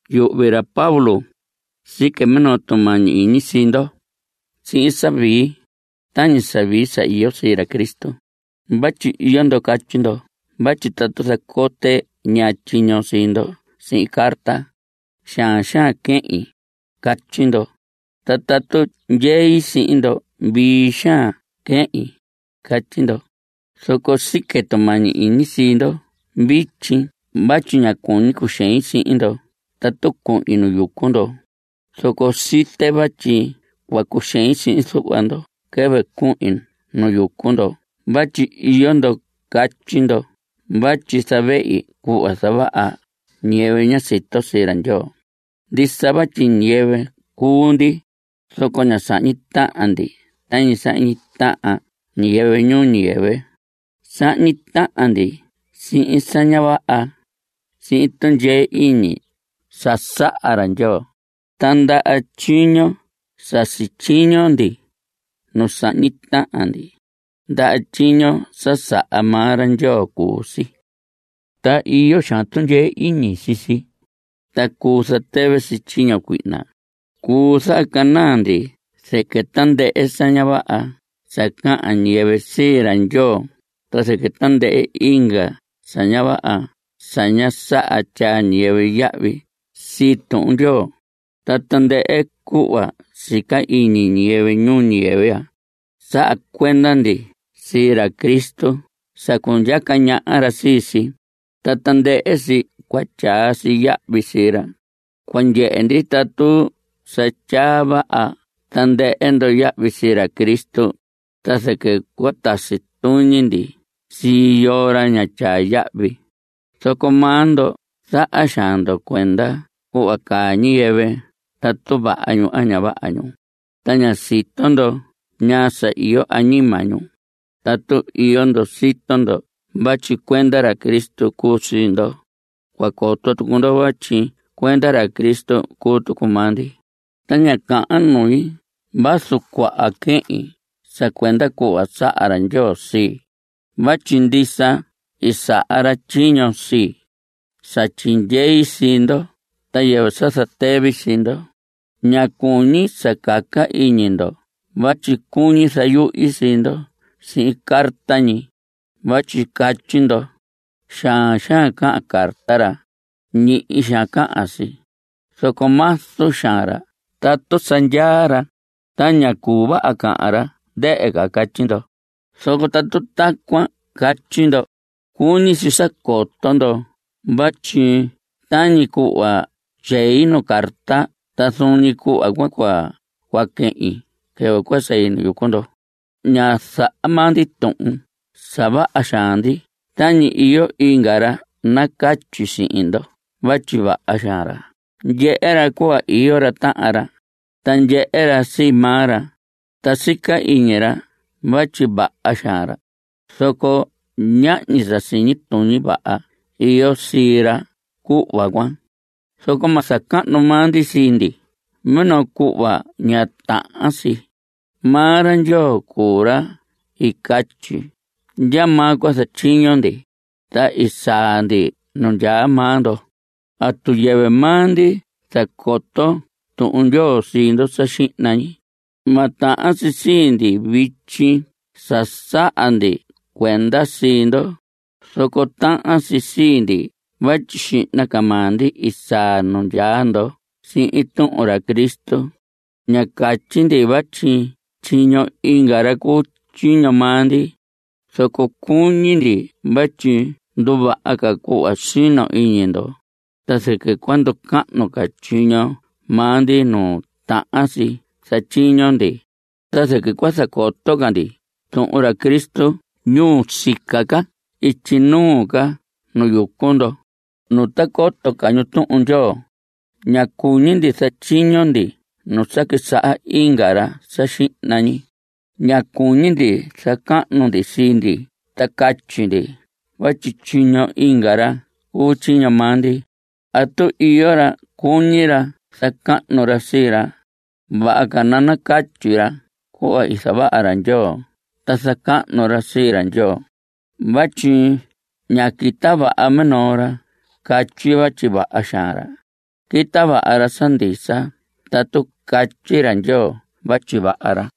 Yuhvi ra Pablo sique minoo tumañi iñi sii ndo sihin sa vii, tañi sa vii sa iyo sii ra Cristo. Vatyi iyo ndo catyi ndo vatyi tatu zacote ñaa tyiño sii ndo sihin carta, xaan xaan quehin, catyi ndo. Ta tatu ndyei sihin ndo vii xaan quehin, catyi ndo. Zoco sique tumañi iñi sii ndo vityi vatyi ña cuñi cuxein sihin ndo tatu cuhin nu yucu ndo. Zoco site vatyi cua cuxein sihin zuhva ndo quɨvɨ cuhin nu yucu ndo vatyi iyo ndo catyi ndo vatyi zavehi cuhva zavaha ñiyɨvɨ ña sito sii ra Ndyoo. Ndisa vatyi ñiyɨvɨ cuu ndi, zoco ña sahñi tahan ndi tañi sahñi tahan ñiyɨvɨ ñuu ñiyɨvɨ. Sahñi tahan ndi sihin sa ña vaha sihin tundyee iñi sa saha ra Ndyoo. Ta ndaha tyiño sa sityiño ndi nu sahñi tahan ndi, ndaha tyiño sa saha maa ra Ndyoo cuu si. Ta iyo xaan tundyee iñi sii si, ta cuu zatɨvɨ si tyiño cuihna. Cuu zahacanaa ndi zɨquɨ tandɨhɨ sa ña vaha sa cahan ñiyɨvɨ sii ra Ndyoo ta zɨquɨ tandɨhɨ inga sa ña vaha sa ña saha tyaa ñiyɨvɨ yahvi sii Tuhun Ndyoo. Ta tandɨhɨ cuhva sica iñi ñiyɨvɨ ñuu ñiyɨvɨ ya, saha cuenda ndi sii ra Cristo sa cundyaca ñaha ra sii si, ta tandɨhɨ si cua tyaa si yahvi sii ra. Cua ndyehe ndi tatu sa tyaa vaha tandɨhɨ ndo yahvi sii ra Cristo, ta zɨquɨ cua tasi tuñi ndi sii yoo ra ña tyaa yahvi. Zoco maa ndo zaha xaan ndo cuenda cuhva caa ñiyɨvɨ tatu vaha ñu a ña vaha ñu, ta ña sito ndo ñaa sa iyo añima ñu. Tatu iyo ndo sito ndo vatyi cuenda ra Cristo cuu ndo, cua coto tucu ndo vatyi cuenda ra Cristo cuu tucu maa ndi. Ta ña cahan nui vazu cuaha quehin sa cuenda cuhva saha ra Ndyoo sii, vatyi ndisa i saha ra tyiño sii, sa tyindyei sii ndo ta yɨvɨ sa zatɨvi sii ndo. Ña cuñi sa caca iñi ndo vatyi cuñi zayuhi sii ndo sihin carta ñi. Vatyi catyi ndo: Xaan xaan cahan carta ra. Ñihi xaan cahan si. Zoco mazu xaan ra tatu sa ndyaa ra, ta ña cuu vaha cahan ra, ndɨhɨ ca. Catyi ndo. Zoco tatu tacuan catyi ndo, cuñi si sa coto ndo vatyi tañi cuhva tyei nuu carta ta zuun ñi cuhva cuan cua quehin quɨvɨ cua sei nu yucu ndo. Ña zaha maa ndi tuhun sa vaha xaan ndi tañi iyo inga ra nacatyi sihin ndo vatyi vaha xaan ra. Ndyehe ra cuhva iyo ra tahan ra, ta ndyehe ra sii maa ra, ta sica iñi ra vatyi vaha xaan ra. Zoco ñahñi sa siñi tuñi vaha iyo sii ra cuhva cuan. Zoco ma zacahnu maa ndi sii ndi minoo cuhva ña tahan si. Maa ra Ndyoo cuu ra i catyi ndyamaa cua zatyiño ndi, ta i saa ndi nu ndyaa maa ndo. Tatu yɨvɨ maa ndi zacoto Tuhun Ndyoo sii ndo sa xihna ñi, ma tahan si sii ndi vityi sa zaha ndi cuenda sii ndo. Zoco tahan si sii ndi vatyi xihna ca maa ndi i saa nu ndyaa ndo sihin tuhun ra Cristo. Ña catyi ndi vatyi tyiño inga ra cuu tyiño maa ndi. Zoco cuñi ndi vatyi nduvaha ca cuhva sino iñi ndo, ta zɨquɨ cua nducahnu ca tyiño maa ndi nu tahan si zatyiño ndi. Ta zɨquɨ cua zacoto ca ndi tuhun ra Cristo ñuu sica ca ityi nuu ca nu yucu ndo, nu ta coto ca ñu Tuhun Ndyoo. Ña cuñi ndi zatyiño ndi nu sa quisaha inga ra sa xihna ñi. Ña cuñi ndi zacahnu ndi sii ndi ta catyi ndi vatyi tyiño inga ra cuu tyiño maa ndi. Tatu iyo ra cuñi ra zacahnu ra sii ra, vaha ca nacatyi ra cuhva i zavaha ra Ndyoo ta zacahnu ra sii ra Ndyoo. Vatyi ña quita vaha minoo ra catyi vatyi vaha xaan ra. Quita vaha ra sa ndisa tatu catyi ra Ndyoo vatyi vaha ra.